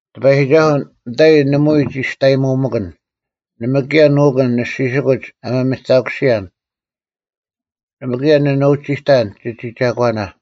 ᑎᐸᔨᒋᒐᓱᐤ, ᓂᑕᐃ ᓇᒪᐎᔾ ᒋᔅᑕᔨᒧᒪᑭᓐ, ᓇᒪ ᑭᔭ ᓄᑯᓐ ᓂᔅᒋᓯᑯᒡ ᐊ ᒥᒥᑕᑯᓯᔭᓐ; ᓇᒪ ᑭᔭ ᓂ ᓄᒋᑕᓐ ᒋᒋ ᒐᒂᓇ,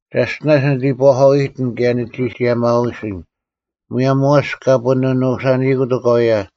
ᒐᔅᑎᓇᔅ ᓂ ᐃᑈᐧᑲᐅ-ᐃᑎᓐ ᑭᔭ ᓂᒋ ᒋᔭᒪᐎᓯᓐ, ᒧᔭᒻ ᐊᐛᔅ ᑲ ᐳᓂ ᓄᓴᓂᐃᑯᑦ ᐅᑲᐎᔭ: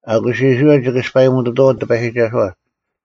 ᐊᑯᔅ ᐃᔅᕋᐃᓪ ᒋᑭ ᐊᔅᐸᔨᒧᑐᑐᐛᐤ ᑎᐸᔨᒋᒐᓱᐛ,